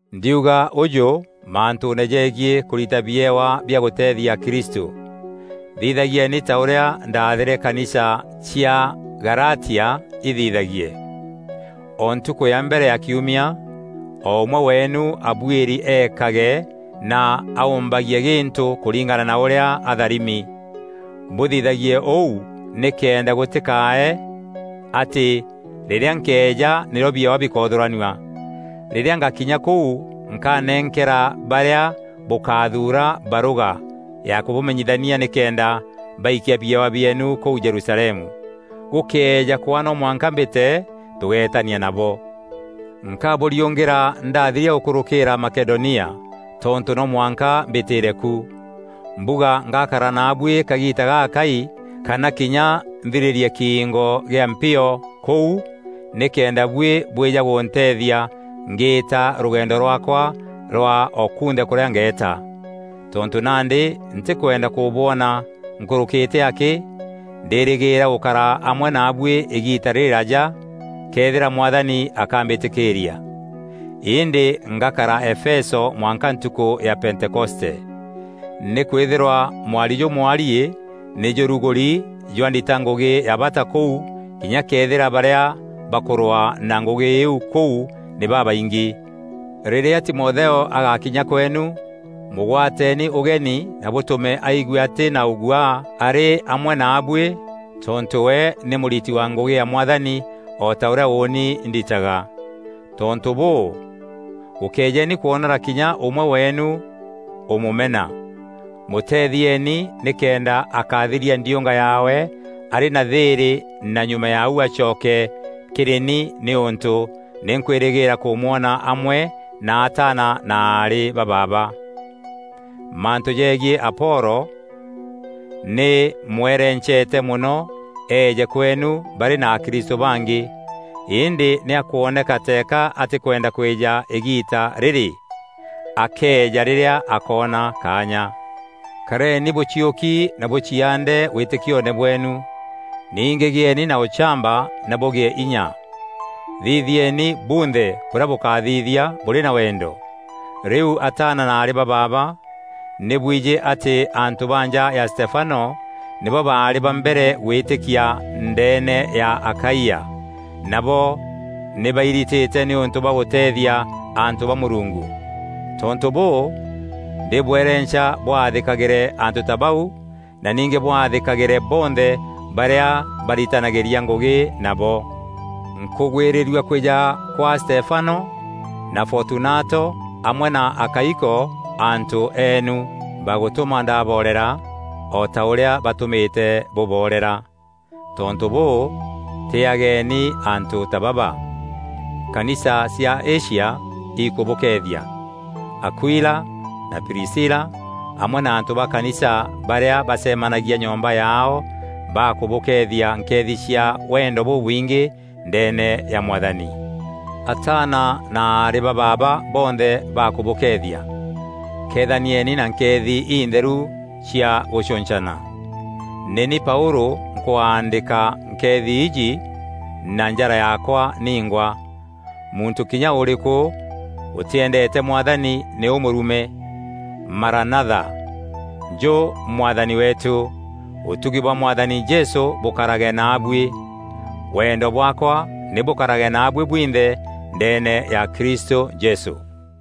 Ndîuga ûjû mantûûne jegiî kûrita biewa bia gûteethia akristû: thithagieni ta ûrîa ndaathîre kanisa cia Galatia ithithagie. O ntukû ya mbere ya kiumia, o ûmwe weenu abuîri eekage na aûûmbagie gîntû kûringana na ûrîa atharimi. Bûthithagie ûu nîkenda gûtîkae atî rîrîa nkeeja nîrîo biewa bikoothûranua. Rîrîa ngakinya kûu nkanenkera barîa bûkathuura barûga ya kûbamenyithania nîkenda baikia biewa bieenu kûu Jerusalemu. Gûkëeja kwaa no mwanka mbîte, tûgeetania nabo. Nkabûriûngîra ndathiria gûkûrûkîîra Makedonia, tontû no mwanka mbîtîîre ku. Mbuga ngakara naabuî kagiita gagakai kana kinya nthirîrîe kiingo gîa mpio kûu, nîkenda buî bwîja gûnteethia ngîîta rûgeendo rwaakwa rwa o kunthe kûrîa ngeeta. Tontû nandî ntîkwenda kûbwona nkûrûkîte akî, ndîrîgîîra gûkara amwe naabuî îgiita rîrîraja këethîra Mwathani akambîtîkîîria. Îndî ngakara Efeso mwanka ntukû ya Pentekoste. Nîkwîthîrwa mwari jûmwariî nî jûrugûri jwa ndita ngûgî ya bata kûu kinya këethîra barîa bakûrwaa na ngûgî îîu kûu nî babaingî. Rîrîa Timotheo agakinya kweenu, mûgwateeni ûgeni na bûtûme aigue atî na ûguaa arî amwe naabuî tontû we nî mûriti wa ngûgî ya Mwathani o ta ûrîa ûûni nditaga. Tontû bûû, gûkéejeni kwonora kinya ûmwe weenu ûmûmena. Mûteethieeni nîkenda akathiria ndiûnga yaawe arî na thîîrî na nyuma ya ûu acoke kîrî ni nîûntû nî nkwîrîgîîra kûmwona amwe na ataana na aarî ba baaba. Mantû jeegiî Apolo, nî mwerencete mono eeje kweenu barî na akristû bangî, îndî nî akwoneka teeka atîkwenda kwîja îgiita rîrî. Akeeja rîrîa akoona kaanya. Kareni bûciûki na bûciaande wîtîkioone bweenu. Ningî gîeeni na ûchamba na bûgîe inya. Thithieni bûnthe bûrîa bûkathithia bûrî na wendo. Rîu ataana na aarî ba baaba, nî bwijî atî antû ba nja ya Stefano nîbo baarî ba mbere gwîtîkia ndeene ya Akaia, nabo nî bairitîte nîûntû bwa gûteethia antû ba Mûrungu. Tontû bûû, ndîbwerenca bwathîkagîre antû ta bau na ningî bwathîkagîre bonthe barîa baritanagîria ngûgî nabo. Nkûgwîrîrua kwîja kwa Stefano, na Fotunato amwe na Akaiko antû eenu. Bagûtûma ndaboorera o ta ûrîa bûtûmîte bûboorera. Tontû bûû, tîîageni antû ta baba. Kanisa cia Asia ikûbûkeethia. Akuila na Prisila, amwe na antû ba kanisa barîa bacemanagia nyomba yaao bakûbûkeethia nkeethi cia wendo bûbwingî ndeene ya Mwathani. Ataana na aarî ba baaba bonthe bakûbûkeethia. Keethanieni na nkeethi intheru cia gûcûncana. Nî ni Paûlû nkwaandîka nkeethi iji na njara yaakwa ningwa. Muntû kinya ûrîkû ûtîendeete Mwathani nî ûmûrume. Maranatha - Njû Mwathani weetû! Ûtugi bwa Mwathani Jesû bûkarage naabuî. Wendo bwaakwa nî bûkarage naabuî bwinthe ndeene ya Kristû Jesû.